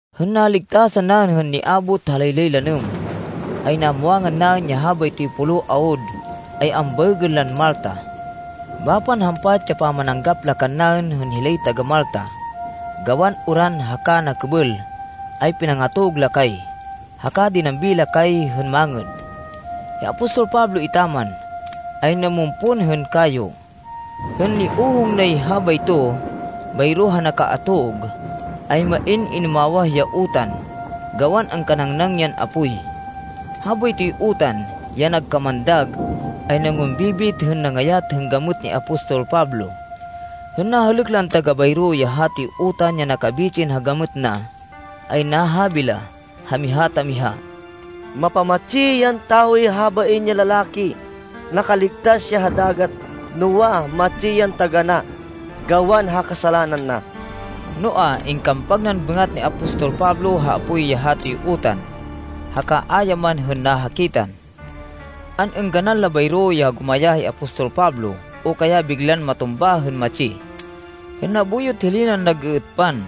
Hên naligtasan naên hên niabot ha laylay lanêm, ay namwangan naên ya habaytoy pulo awud ay ambaêgên lan Malta. Bapan hampat ya pamananggap la kannaên hên hilay taga-Malta. Gawan uran haka nakêbêl, ay pinangatog la kay, haka dinambi la kay hên mangêd. Hi apostol Pablo etaman, ay namumpon hên kayo. Hên niohong na habayto bayro ha nakaatog, ay main inumawah ya utan gawan angkanangnang yan apoy. Habaytoy utan, ya nagkamandag, ay nangumbibit hên nangayat hên gamêt ni apostol Pablo. Hên nahêlêk lan taga bayro ya hatoy utan ya nakabitsin ha gamêt na, ay nahabi la ha miha ta miha, “Mapamatsi yan tawoy habain ya lalaki. Nakaligtas ya ha dagat, noa, matsi yan taganá gawan ha kasalanan na.” Noa, ingkampag nan bêngat ni apostol Pablo ha apoy ya hatoy utan, haka a ya man hên nahakitan. An-êngganan la bayro ya gumayá hi apostol Pablo o kaya biglan matumba hên matsi. Hên nabuyot hilay nan nag-êêtpan,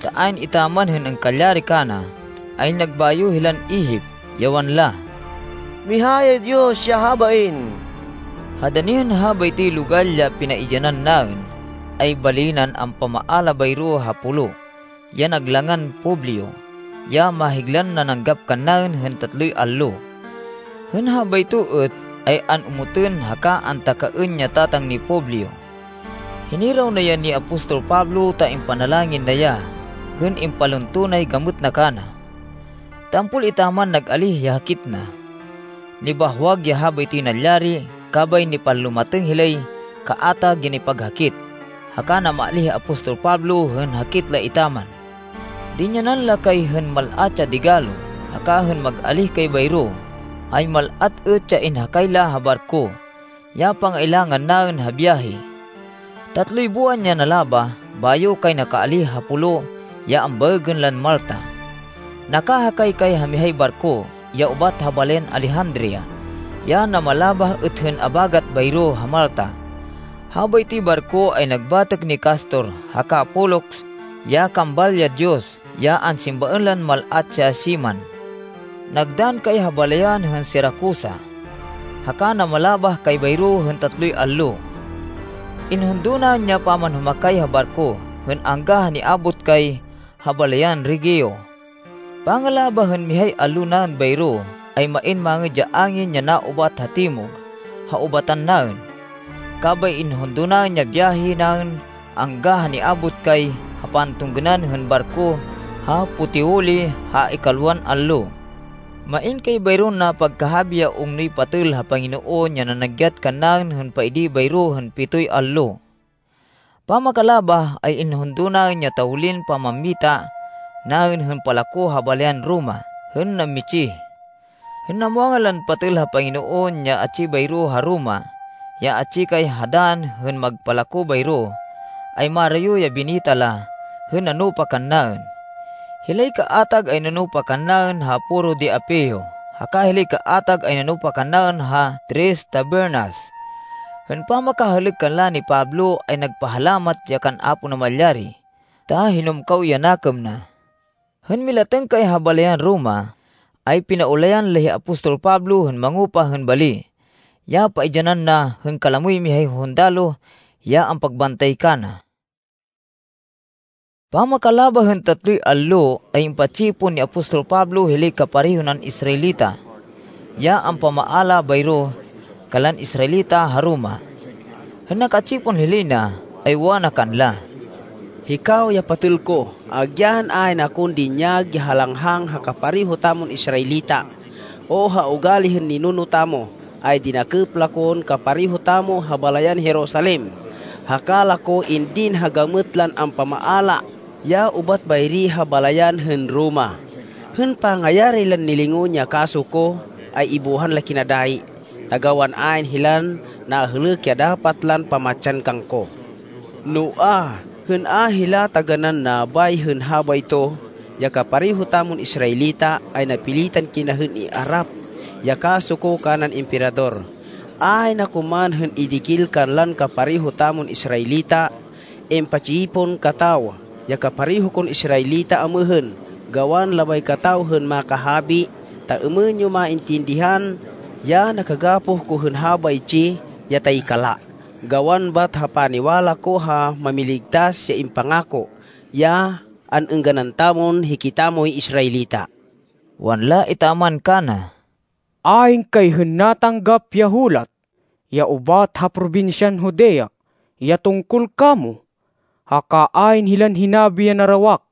ta ayn etaman hên angkalyari kana, ay nagbayo hilan ihip, ya wanla, “Miha yay diyos ya habain!” Ha dani hên habaytoy logal ya pinaidyanan naên ay bali nan ampamaala bayro ha pulo, ya nag langan Publio, ya mahiglan nananggap kannaên hên tatloy allo. Hên habayto êt, ay an-omotên haka antakaên ya tatang ni Publio. Hiniraw na ya ni apostol Pablo ta impanalangin na ya hên impalunto nay gamêt na kana. Tampol etaman nag-alíh ya hakit na. Nibahwag ya habaytoy nalyari, kabay nipanlumatêng hilay kaatag ya nipaghakit, haka namaalíh hi apostol Pablo hên hakit la etaman. Dinyanan la kay hên mal-at ya digalo, haka hên mag-alíh kay bayro, ay mal-at êt ya inhakay la ha barko, ya pangailangan naên ha biyahe. Tatloy buwan ya nalabah bayo kay nakaalíh ha pulo ya ambaêgên lan Malta. Nakahakay kay ha mihay barko, ya ubat ha balayan Alejandria, ya namalabah êt hên abagat bayro ha Malta. Habaytoy barko ay nag batêk ni Castor haka Polux ya kambal, ya diyos, ya ansimbaên lan mal-at ya siman. Nagdann kay ha balayan hên Siracusa, haka namalabah kay bayro hên tatloy allo. Inhundo naên ya pamanhumakay ha barko, hên angga ha niabot kay ha balayan Regio. Pangalabah hên mihay allo naên bayro, ay main mangêd ya angin ya naubat ha timog ha ubatan naên, kabay inhundo naên ya biyahe naên angga ha niabot kay ha pagtunggênan hên barko ha Puteoli ha ikalwan allo. Main kay bayron napagkahabi ya ungnoy patêl ha Panginoon ya nanagyat kannaên hên paidi bayro hên pitoy allo. Pamakalabah, ay inhundo naên ya tawlin pamammita naên hên palako ha balayan Roma hên nammitsih. Hên namwangan lan patêl ha Panginoon ya atsi bayro ha Roma, ya atsi kay ha dann hên magpalako bayro, ay marayo ya binita la hên nanupa kannaên. Hilay kaatag ay nanupa kannaên ha Foro de Apio, haka hilay kaatag ay nanupa kannaên ha Tres Tabernas. Hên pamakahêlêk kanla ni Pablo ay nagpahalamat ya kan Apo Namalyari, ta hinumkaw ya nakêm na. Hên milatêng kay ha balayan Roma, ay pinaulayan la hi apostol Pablo hên mangupa hên bali, ya paidyanan na hên kalamoy mihay hundaloh ya ampagbantay kana. Pamakalabah hên tatloy allo, ay impa-tsipon ni apostol Pablo hilay kapareho nan Israelita, ya ampamaala bayro kanlan Israelita ha Roma. Hên naka-tsipon hilay na, ay wana kanla, “Hikaw ya patêl ko, agyan ayn akon dinyag ya halanghang ha kapareho tamon Israelita, o ha ugali hên ninuno tamo, ay dinakêp la kon kapareho tamo ha balayan Jerusalem, haka la ko indin ha gamêt lan ampamaala ya ubat bayri ha balayan hên Roma. Hên pangayari lan nilingon ya kaso ko, ay ibuhan la kina dayi ta gawan ayn hilan nahêlêk ya dapat lan pamatsan kangko. Noa, hên a hila taganán nabay hên habayto, ya kapareho tamon Israelita, ay napilitan kina hên iarap ya kaso ko kanan Emperador, ayn ako man hên idikil kanlan kapareho tamon Israelita. Impa-tsipon kataw ya kapareho kon Israelita amêhên, gawan labay kataw hên makahabi, ta êmên yo maintindihan ya nakagapoh ko hên habaytsi ya taykala, gawan bat ha paniwala ko ha Mámiligtas ya impangako, ya an-êngganan tamon hikitamoy Israelita.” Wanla etaman kana, “Ayn kay hên natanggap ya hulat ya ubat ha probinsyan Judea ya tungkol kamo. Haka ayn hilan hinabi ya narawak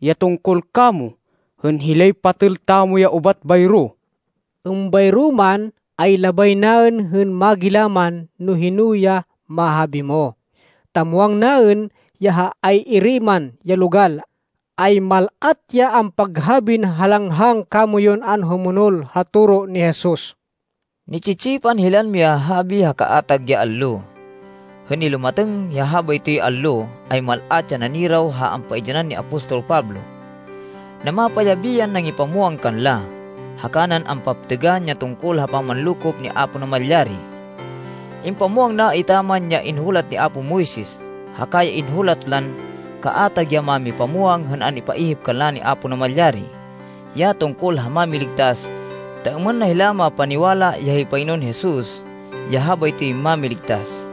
ya tungkol kamo hên hilay patêl tamo ya ubat bayro. Êmbayro man, ay labay naên hên magilaman no hino ya mahabi mo, ta muwang naên ya ha ay-iri man ya logal, ay mal-at ya ampaghabin halanghang kamoyun anhumonol ha toro ni Jesus.” Ni-tsi-tsipan hilan mihahabi ha kaatag ya allo. Hên nilumatêng ya habaytoy allo, ay mal-at ya naniraw ha ampaidyanan ni apostol Pablo. Namapayabi yan nangipamwang kanla, haka nan ampaptêgan ya tungkol ha pamanlokop ni Apo Namalyari. Impamwang na etaman ya inhulat ni apo Moises, haka ya inhulat lan kaatag ya mámipamwang hên an-ipaihip kanla ni Apo Namalyari, ya tungkol ha Mámiligtas, ta êmên na hila mapaniwala ya hi Panginoon Jesus ya habaytoy Mámiligtas.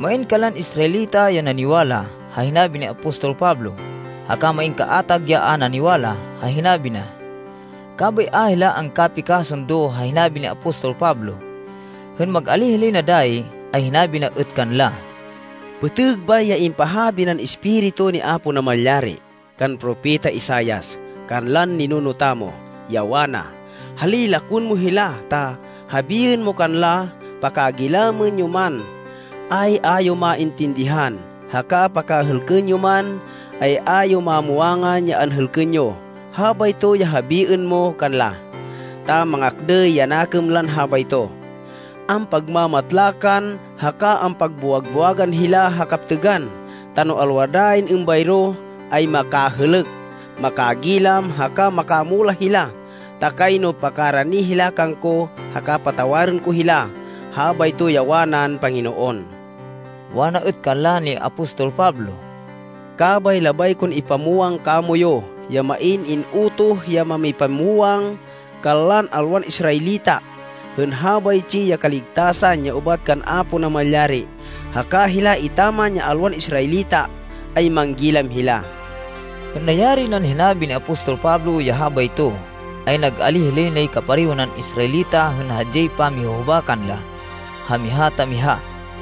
Main kanlan Israelita ya naniwala ha hinabi ni apostol Pablo, haka main kaatag ya a naniwala ha hinabi na. Kabay a hila angkapikasundo ha hinabi ni apostol Pablo. Hên mag-alíh hilay na dayi, ay hinabi na êt kanla, “Pêtêg bay ya impahabi nan Espiritu ni Apo Namalyari kan Propeta Isaias, kanlan ninuno tamo, ya wana, ‘Hali, lakwên mo hila ta habiên mo kanla, Pakagilamên yo man, ay a yo maintindihan, haka pakahêlkên yo man, ay a yo mamwangan ya anhêlkên yo. Habayto ya habiên mo kanla, ta mangakdêy ya nakêm lan habayto. Ampagmamatlakan, haka ampagbuwag-buwagan hila ha kaptêgan, ta no alwa dayin êmbayro, ay makahêlêk, makagilam, haka makamulah hila, ta kayno pakarani hila kangko, haka patawarên ko hila.’ Habayto ya wanan Panginoon.” Wana êt kanla ni apostol Pablo, “Kabay labay kon ipamwang kamoyu ya main in-utoh ya mamipamwang kanlan alwan Israelita, hên habaytsi ya kaligtasan ya ubat kan Apo Namalyari. Haka hila etaman ya alwan Israelita, ay manggilam hila.” [Hên nayari nan hinabi ni apostol Pablo ya habayto, ay nag-alíh hilay nay kapareho nan Israelita hên hadyay pamihuhubakan la ha miha ta miha.]